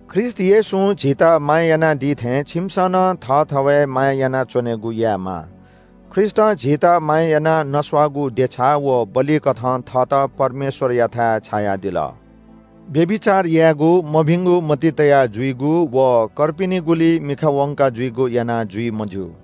ख्रीष्‍ट येशूं झीत माया यानादी थें छिमिसं नं थःथवय् माया यानाः च्‍वनेगु यायेमाः। ख्रीष्‍टं झीत माया यानाः नस्‍वाःगु देछा व बलिकथं थःत परमेश्‍वरयाथाय् छायादिल। व्‍यभिचार यायेगु, मभिंगु मतिइ तया जुइगु व कर्पिनिगुली मिखा वंकाः जुइगु यानाः जुइ मज्‍यू।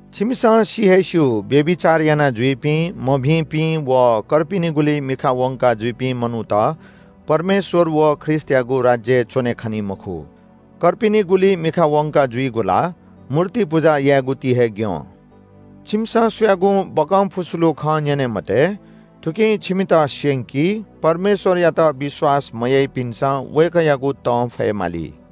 छिमिसं सि हे स्‍यू, व्‍यभिचार यानाजुइपिं, मभिंपिं व कर्पिनिगुली मिखा वंकाः जुइपिं मनूत परमेश्‍वर व ख्रीष्‍टयागु राज्‍यय् च्‍वने खनी मखु। कर्पिनिगुली मिखा वंकाः जुइगु ला मूर्ति पुजा यायेगु ति हे ग्‍यं। छिमिसं सुयागुं बकंफुस्‍लु खँ न्‍यने मते। थुकिं छिमित स्‍यंकी। परमेश्‍वरयात विश्‍वास मयाइपिन्‍सं वय्‌कःयागु तं फयेमाली।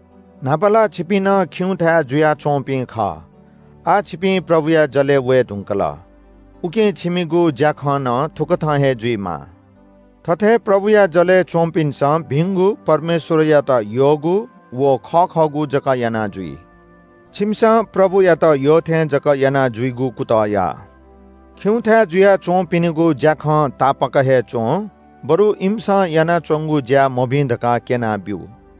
न्‍हापा ला छिपिं नं खिउँथाय् जुयाच्‍वंपिं खः। आः छिपिं प्रभुया जलय् वये धुंकल। उकिं छिमिगु ज्‍याखँ नं थुकथं हे जुइमाः। थथे प्रभुया जलय् च्‍वंपिन्‍सं भिंगु, परमेश्‍वरयात यःगु व खः खःगु जक याना जुइ। छिमिसं प्रभुयात यःथें जक यानाजुइगु कुतः या। खिउँथाय् जुयाच्‍वंपिनिगु ज्‍याखं तापाक हे च्‍वँ, बरु इमिसं यानाच्‍वंगु ज्‍या मभिं धकाः क्‍यनाब्‍यु।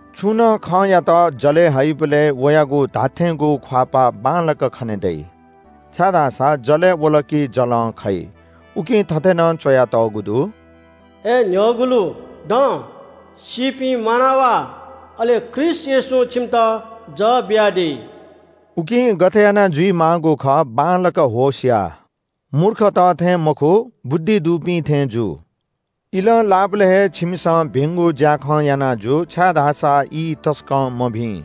छुं नं खँयात जलय् हइबलय् वयागु धात्‍थेंगु ख्‍वाःपाः बांलाक खने दइ। छाय्‌धाःसा जलय् वल कि जलं खइ। उकिं थथे नं च्‍वयातःगु दु – “अय् न्‍ह्यःगुलु दँ, सीपिं म्‍वाना वा। अले ख्रीष्‍ट येशूं छिमित जः बियादी।” उकिं गथे यानाः जुइमाःगु खः बांलाक होश या। मूर्खत थें मखु, बुद्धि दुपिं थें जु। इलं लाःबलय् हे छिमिसं भिंगु ज्‍याखँ याना जु, छाय्‌धाःसा ई तसकं मभिं।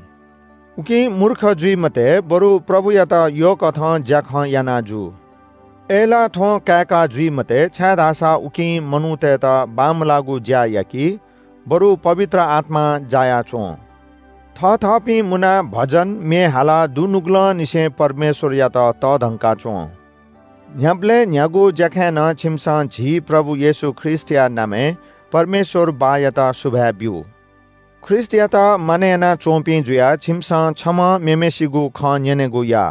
उकिं मूर्ख जुइ मते, बरु प्रभुयात यःकथं ज्‍याखँ याना जु। अय्‌लाः थ्‍वँ काय्‌का जुइ मते, छाय्‌धाःसा थुकिं मनूतय्‌त बांमलाःगु ज्‍या याकी, बरु पवित्र आत्‍मां जाया च्‍वँ। थथःपिं मुनाः भजन, म्‍ये हालाः दुनुगलंनिसें परमेश्‍वरयात तःधंका च्‍वँ। न्‍ह्याबलें न्‍ह्यागु ज्‍याखँय् नं छिमिसं झी प्रभु येशू ख्रीष्‍टया नामय् परमेश्‍वर बाःयात सुभाय् ब्‍यु। ख्रीष्‍टयात मानय् यानाच्‍वंपिं जुयाः छिमिसं छम्‍हं मेम्‍हय्‌सिगु खँ न्‍यनेगु या।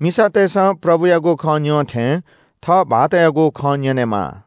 मिसातय्‌सं प्रभुयागु खँ न्‍यं थें थः भाःतयागु खँ न्‍यनेमाः।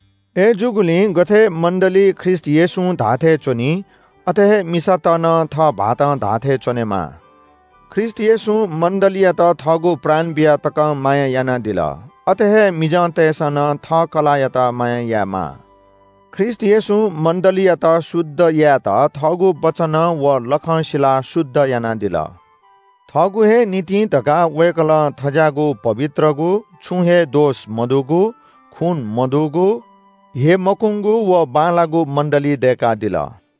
अय्‌जूगुलिं गथे मण्‍डली ख्रीष्‍ट येशूं धाःथें च्‍वनी, अथे हे मिसात नं थः भाःतं धाःथें च्‍वनेमाः। ख्रीष्‍ट येशूं मण्‍डलीयात थःगु प्राण बिया तकं माया यानादिल। अथे हे मिजंतय्‌सं नं थः कलाःयात माया यायेमाः। ख्रीष्‍ट येशूं मण्‍डलीयात शुद्ध यायेत थःगु वचनं व लखं सिलाः शुद्ध यानादिल। थःगु हे निंतिं धकाः वय्‌कलं थज्‍याःगु पवित्रगु, छुं हे दोष मदुगु, खू मदुगु, स्‍यमकूंगु व बांलाःगु मण्‍डली दय्‌कादिल।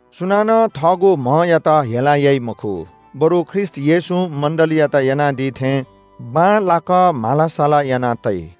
सुनानं थःगु म्‍हयात हेला याइ मखु, बरु ख्रीष्‍ट येशूं मण्‍डलीयात यानादी थें बांलाक म्‍हाला-साला याना तइ।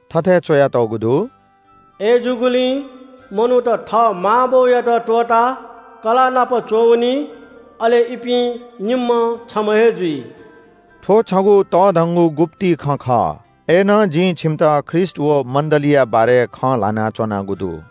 थथे च्‍वयातःगु दु – “अय्‌जूगुलिं मनूत थः मां बौयात त्‍वःताः कलाःनापं च्‍वंवनी। अले इपिं निम्‍हं छम्‍ह हे जुइ।” थ्‍व छगू तःधंगु गुप्‍ति खँ खः। अय्‌नं जिं छिमित ख्रीष्‍ट व मण्‍डलीया बारे खँ ल्‍हाना च्‍वनागु दु।